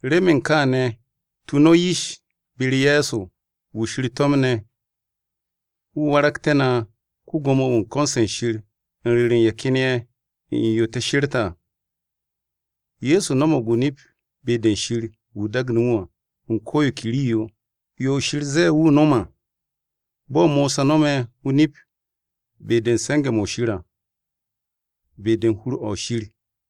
Remen kaane̱, tu no̱ yish be-u̱r Ye̱so, wu̱ Shir to̱mne̱, wu̱ waragte̱ na ko-Gwo̱mo-wu̱ u̱n ko̱n-se Shir u̱n ru̱ru̱ u̱n ye̱ ken ye̱ ne̱ u̱n yo te̱ she̱rte̱ à. Ye̱so no̱mo̱g o-nip be-de Shir wu̱ daage̱ wu̱ à, u̱n ko̱ yo ke rii-yo, yo Shir zee wu̱ nom à, bo̱ Mosa no̱me̱ o-nip be-de u̱n se̱nge̱-mo̱ Shir à, be-de u̱n hur-o Shir.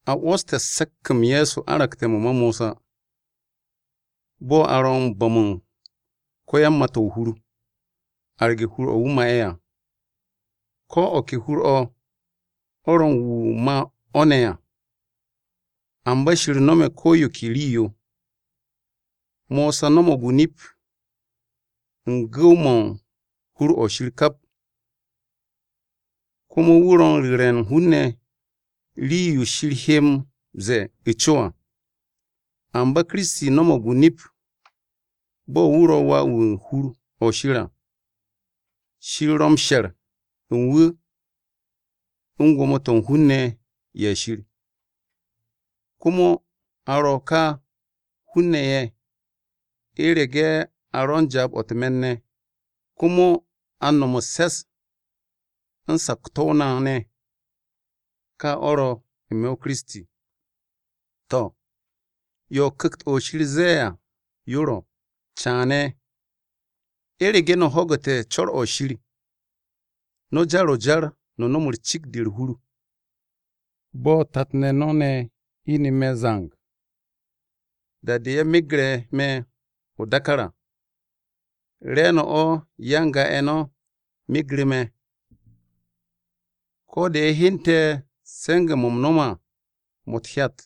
A 'wo̱ste̱ se̱k-m Ye̱so aragte̱ mo̱ ma Mosa, bo̱ a ro̱ u̱n bo̱m u̱n ko-yan-mà-to̱ o-hur, arge̱ hur-o̱ wu̱ ma'e̱ à. Ko̱ o̱ ke hur-o̱, o̱ ro̱ u̱n wu̱ ma o̱ ne̱ à. Amba Shir no̱me̱ ko̱ yo ke rii-yo. Mosa no̱mo̱g o-nip u̱n gu̱w-mo̱ u̱n hur-o̱ Shir kap, komo wu̱ ro̱ u̱n ru̱re̱ hun-ne̱ rii-yo Shir he m-ze̱e̱ u̱ co à. Amba Kiristi no̱mo̱g o-nip bo̱ wu̱ ro̱ Wà u̱n hur-o̱ Shir à. Shir ro̱ m-she̱r u̱n wu̱ u̱n gwo̱mo-to̱ u̱n hun-ne̱ ye̱ Shir. Komo a ro̱ ká hun-ne̱ ye̱, u̱rege̱ a ro̱ u̱n jaab-o̱ u̱t-me̱n ne̱, komo a nom u̱s-se̱s u̱n sakto̱-o na ne̱, ka o̱ ro̱ n-me̱ Kiristi. To̱, yo Ku̱kt-o̱ Shir zee à, yo ro̱: “Caane̱, u̱rege̱ no̱ ho̱gu̱te̱ co̱r-o̱ Shir, no̱ jar-o jar no̱ nom cikt-de u̱r-hur bo̱ tat-ne̱ no̱ ne̱ ine̱ me̱ zang, da-de ye̱ megre̱ me̱ o-dákár á. Re̱e̱no̱ o̱ ya-n-ga-ye̱ no̱ megre̱ me̱, Ko̱ de ye̱ hyente̱ se̱nge̱-mo̱ u̱m no̱me̱ à, mo̱ u̱t-hyat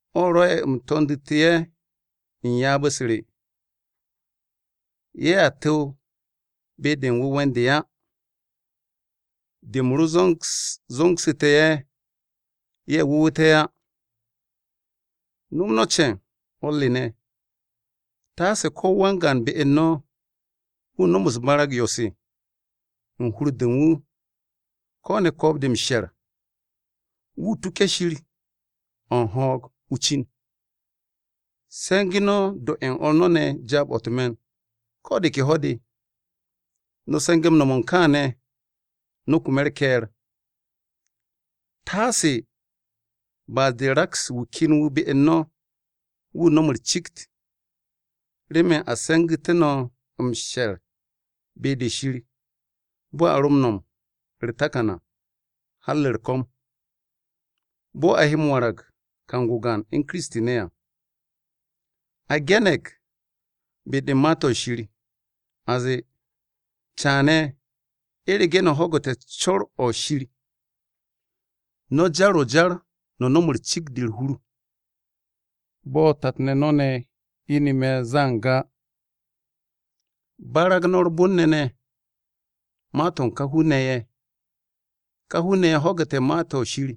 O̱ rwo̱'e̱ u̱m to̱ndu̱tu̱ ye̱ u̱n ryaab-u̱s re. ‘Ye̱a tu̱w be-de u̱n wu̱we̱ u̱n de á, de u̱m ro zo̱ngsu̱tu̱ ye̱, ye̱ wu̱wu̱te̱ á.’” No̱m no̱ ce̱e̱n, o̱r re ne̱, taase ko̱ wan-gaan be u̱n no̱ wu̱ no̱m barag-u̱s 'yo-se u̱n hur-de u̱n wu̱, ko̱ ne̱ ko̱o̱b-de m-she̱r, wu̱ tuke̱ Shir o̱ u̱n ho̱o̱g o-cin. Se̱ngu̱ no̱ do ye̱ u̱n o̱r no̱ ne̱ jaab-o̱ u̱t-me̱n ko̱ de ke ho̱-de, no̱ se̱nge̱ m-no̱m kaane̱ no̱ kume̱ u̱r-ke̱e̱r. Taase ba'as-de raks wu̱ ken be u̱n no̱, wu̱ no̱m u̱r-cikt. Remen a se̱ngu̱tu̱ no̱ m-she̱r gu̱ng gu̱ng be-de Shir bo̱ a ro m-no̱m u̱r-takan à, har u̱r-ko̱m, bo̱ a he m-warag kang-o gaan u̱n Kiristi ne̱ à. A ge̱ne̱g be-de u̱n Ma-to̱ Shir, a zee, “Caane̱, u̱rege̱ no̱ ho̱gu̱te̱ co̱r-o̱ Shir, no̱ jar-o jar no̱ nom cikt-de u̱r-hur, bo̱ tat-ne̱ no̱ ne̱ ine̱ me̱ zang á.” Barag no̱ u̱r-bon ne̱ ne̱ ma-to̱ u̱n ká hun-ne̱ ye̱: Ka hun-ne̱ ye̱ ho̱gu̱te̱ Ma-to̱ Shir,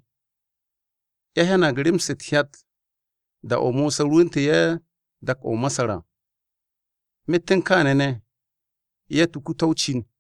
ye̱ hyanag rem-se u̱t-hyat da-o̱ Mosa rwu̱ntu̱ ye̱ dak-o̱ o-Masar à, myet u̱n kaane̱ ne̱, ye̱ tuku to̱ o-cin.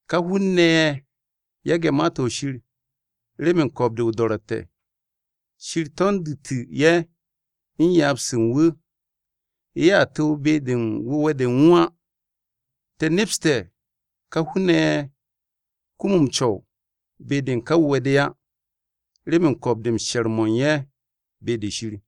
Ká hun-ne̱ ye̱ yage̱ Ma-to̱ Shir remen ko̱o̱b-de o-do̱ro̱tte̱, Shir to̱ndu̱tu̱ ye̱ u̱n ryaab-u̱s u̱n wu̱. Ye̱a tu̱w be-de u̱n wu̱we̱-de u̱n wu̱ á. Te̱ nepste̱ ká hun-ne̱ ye̱ kum m-co̱w be-de u̱n ká wu̱we̱-de á, remen ko̱o̱b-de u̱n she̱r-mo̱ u̱n ye̱ be-de Shir.